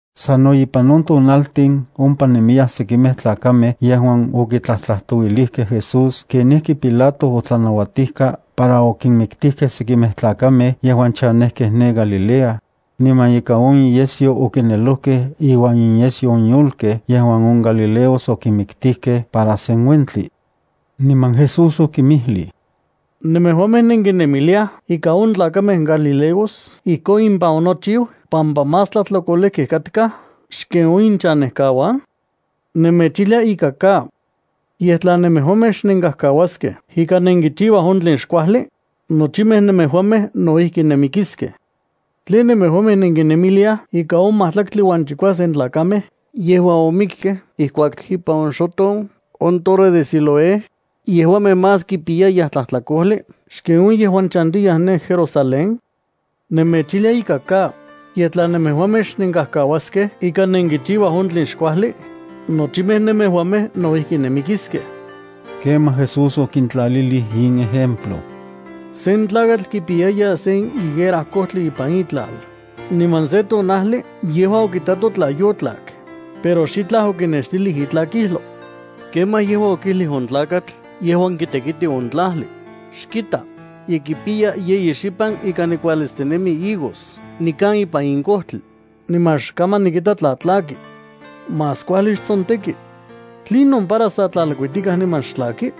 Sano ipan on tonaltin ompa nemiyaj sekimej tlakamej yejuan okitlajtlajtouilijkej Jesús kenijki Pilato otlanauatijka para okinmiktijkej sekimej tlakamej yejuan chanejkej ne Galilea niman ika on inyesyo okinelojkej iuan inyesyo on yolkej yejuan on galileos okinmiktijkej para sen uentli. Niman Jesús okinmijlij: —¿Nemejuamej nenkinemiliaj ika on tlakamej galileos ijkon impan onochiu pampa más tlajtlakolejkej katkaj xken on inchanejkauan? Nemechijlia ika ka. Yej, tla nemejuamej xnenkajkauaskej ika nenkichiuaj on tlen xkuajli, nochimej nemejuamej no ijki nenmikiskej. ¿Tlen nemejuamej nenkinemiliaj ika on majtlaktli uan chikuasen tlakamej yejuan omikkej ijkuak impan oxoton on torre de Siloé, yejuamej más kipiyayaj tlajtlakojli xken on yejuan chantiyaj ne Jerusalén? Nemechijlia ika ka, yej tla nemejuamej xnenkajkauaskej ika nenkichiuaj on tlen xkuajli, nochimej nemejuamej no ijki nenmikiskej. Kemaj Jesús okintlalilij in ejemplo: —Sen tlakatl kipiyaya sen higuera kojtli ipan itlal, niman se tonajli yejua okitato tla yotlak, pero xitlaj okinextilij itlakijlo. Kemaj yejua okijlij on tlakatl yejuan kitekiti on tlajli: “Xkita, ye kipiya yeyi xipan ika nikualitstinemi higos nikan ipan in kojtli, niman xkaman nikita tla tlaki. Más kuajli xtsonteki. ¿Tlinon para san tlalkuitikaj niman xtlaki?”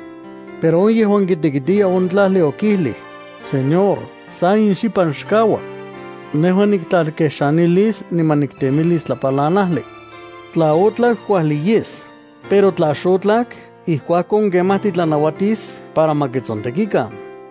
Pero on yejuan kitekitiya on tlajli okijlij: “Señor, sa in xipan xkaua. Nejua niktlalkexanilis niman niktemilis tlapalanajli. Tla otlak kuajli yes, pero tla xotlak, ijkuakon kemaj titlanauatis para ma kitsontekikan.”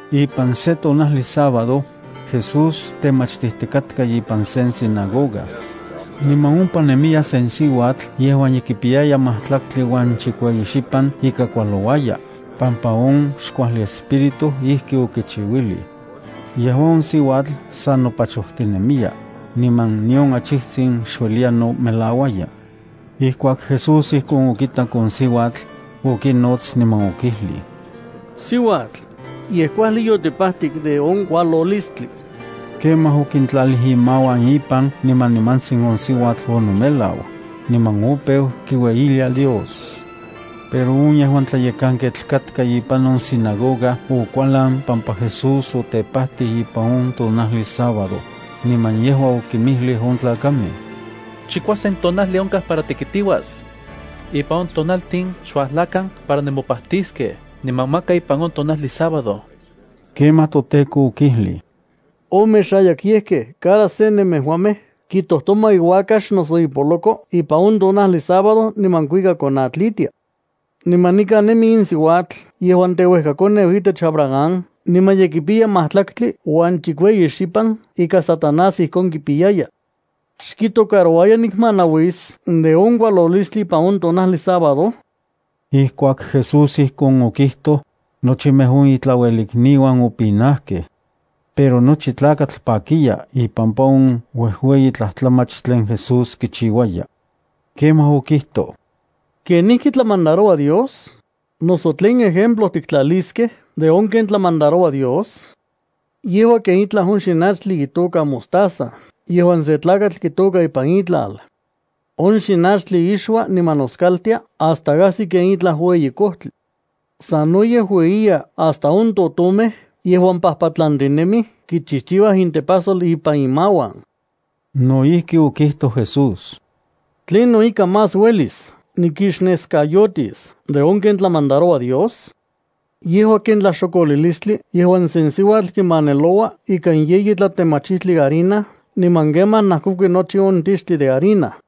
Ipan se tonajli sábado, Jesús temachtijtikatka ipan sen sinagoga. Niman ompa nemiya sen siuatl yejuan ye kipiyaya majtlaktli uan chikueyi xipan ika kualouaya, pampa on xkuajli espíritu ijki okichiuilij. Yejua on siuatl sa nopachojtinemiya, niman nion achijtsin xueliya nomelauaya. Ijkuak Jesús ijkon okitak on siuatl, okinots niman okijlij: —Siuatl, ye kuajli yotipajtik de on kualolistli. Kemaj okintlalij imauan ipan niman nimantsin on siuatl onomelau, niman opeu kiueyilia Dios. Pero on yejuan tlayekanketl katka ipan on sinagoga okualan pampa Jesús otepajtij ipan on tonajli sábado, niman yejua okinmijlij on tlakamej: —Chikuasen tonajli onkaj para tekitiuas. Ipan on tonaltin xuajlakan para nemopajtiskej, niman maka ipan on tonajli sábado. Kemaj toTEKO okijlij: —Omexayakyejkej, cada se nemejuamej kitojtoma iuakax noso ipoloko ipan on tonajli sábado niman kuika konatlitia. Niman nikan nemi in siuatl yejuan teuejkakoneu itech Abraham niman ye kipiya majtlaktli uan chikueyi xipan ika Satanás ijkon kipiyaya. ¿Xkitocarouaya nikmanauis de on kualolistli ipan on tonajli sábado? Ijkuak Jesús ijkon okijtoj, nochimej on itlauelikniuan opinajkej. Pero nochi tlakatl pakiya ipampa on uejueyi tlajtlamach tlen Jesús kichiuaya. Kemaj okijtoj: —¿Kenijki tlamandaroua Dios? ¿Noso tlen ejemplo tiktlaliskej de on ken tlamandaroua Dios? Yejua ken itlaj on xinachtli itoka mostaza yejuan sen tlakatl kitôka ipan itlal. On xinachtli ixua niman noskaltia hasta ajsi ken itlaj ueyi kojtli. Sanoyej ueyiya hasta on totomej yejuan pajpatlantinemij kichijchiuaj intepajsol ipan imauan. No ijki okijtoj Jesús: —¿Tlinon ika más uelis nikixneskayotis de on ken tlamandaroua Dios? Yejua ken tlaxokolilistli yejuan sen siuatl kimaneloua ikan yeyi tlatemachijtli harina niman kemaj najkokui nochi on tixtli de harina.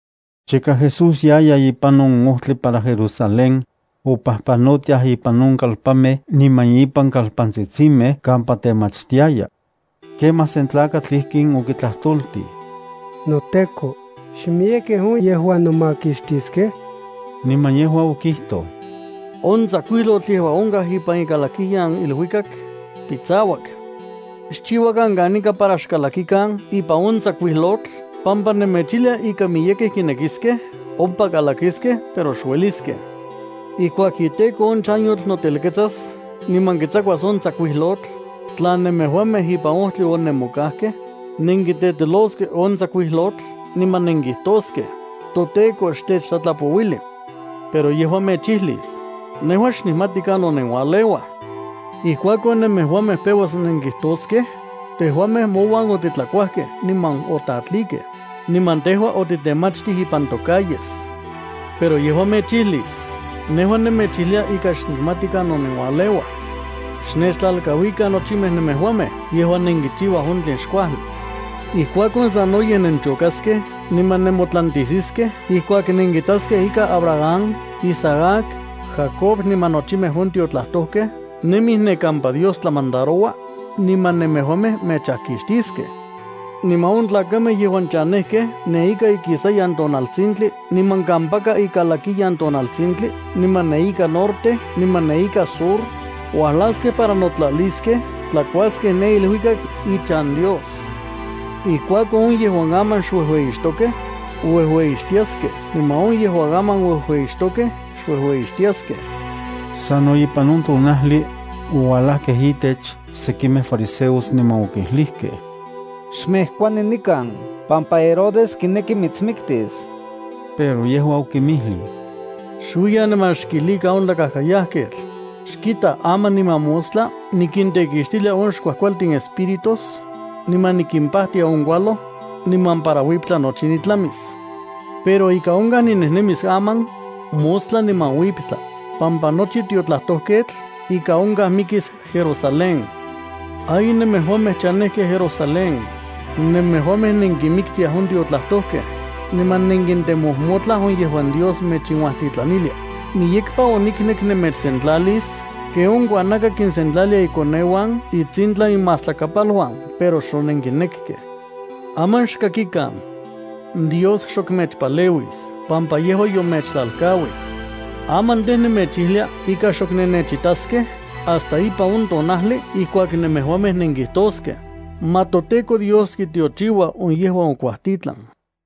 Chika Jesús yaya ipan on ojtli para Jerusalén, opajpanotiaj ipan on kalpanmej niman ipan kalpantsitsimej kampa temachtiaya. Kemaj sen tlakatl ijkin okitlajtoltij: —NoTEKO, ¿xmiyekej on yejuan nomakixtiskej? Niman yejua okijtoj: —On tsakuijlotl yejuan onkaj ipan ikalakiloyan iluikak pitsauak. Xchiuakan kanika para xkalakikan ipan on tsakuijlotl pampa nemechijlia ika miyekej kinekiskej ompa kalakiskej pero xueliskej. Ijkuak iteko on chanyotl notelketsas niman kitsakuas on tsakuijlotl, tla nemejuamej ipan ojtli onemokajkej, nenkiteteloskej on tsakuijlotl niman nenkijtoskej: “ToTeko, xtechtlatlapouili.” Pero yejua mechijlis: “Nejua xnikmati kanon nenualeuaj.” Ijkuakon nemejuamej peuas nenkijtoskej: “Tejuamej mouan otitlakuajkej niman otatlikej, niman tejua otitemachtij ipan tocalles.” Pero yejua mechijlis: “Nejua nemechijlia ika xnikmati kanon nenualeuaj. Xnechtlalkauikan nochimej nemejuamej yejuan nenkichiuaj on tlen xkuajli.” Ijkuakon sanoyej nenchokaskej niman nemotlantijsiskej ijkuak nenkitaskej ika Abraham, Isaac, Jacob niman nochimej on tiotlajtojkej nemij ne kampa Dios tlamandaroua, niman nemejuamej mechajkixtiskej. Niman on tlakamej yejuan chanejkej ne ika ikisayan tonaltsintli niman kampaka ikalakiyan tonaltsintli, niman ne ika norte niman ne ika sur, uajlaskej para notlaliskej tlakuaskej ne iluikak ichan Dios. Ijkuakon, on yejuan aman xuejueyixtokej, uejueyixtiaskej, niman on yejuan aman uejueyixtokej, xuejueyixtiaskej. Sano ipan on tonajli, oualajkej itech sekimej fariseos niman okijlijkej: —Xmejkuani nikan pampa Herodes kineki mitsmiktis. Pero yejua okinmijlij: —Xuiyan niman xkijlikan on tlakajkayajketl: “Xkita, aman niman mostla nikintekixtilia on xkuajkualtin espíritus niman nikimpajtia on kualoj, niman para uiptla nochi nitlamis.” Pero ika onkaj ninejnemis aman, mostla niman uiptla, pampa nochi tiotlajtojketl ika onkaj mikis Jerusalén. ’¡Ay nemejuamej chanejkej Jerusalén, nemejuamej nenkinmiktiaj on tiotlajtojkej niman nenkintemojmotlaj on yejuan Dios mechinuajtitlanilia! ¡Miyekpa oniknek nemechsentlalis ken on kuanaka kinsentlalia ikoneuan itsintlan imajtlapaluan, pero xonenkinekkej! Aman xkakikan. Dios xok mechpaleuis pampa yejua yomechtlalkauij. Aman tej, nemechijlia ika xok nennechitaskej hasta ipan on tonajli ijkuak nemejuamej nenkijtoskej: “Ma toTEKO Dios kitiochiua on yejuan okuajtitlan.”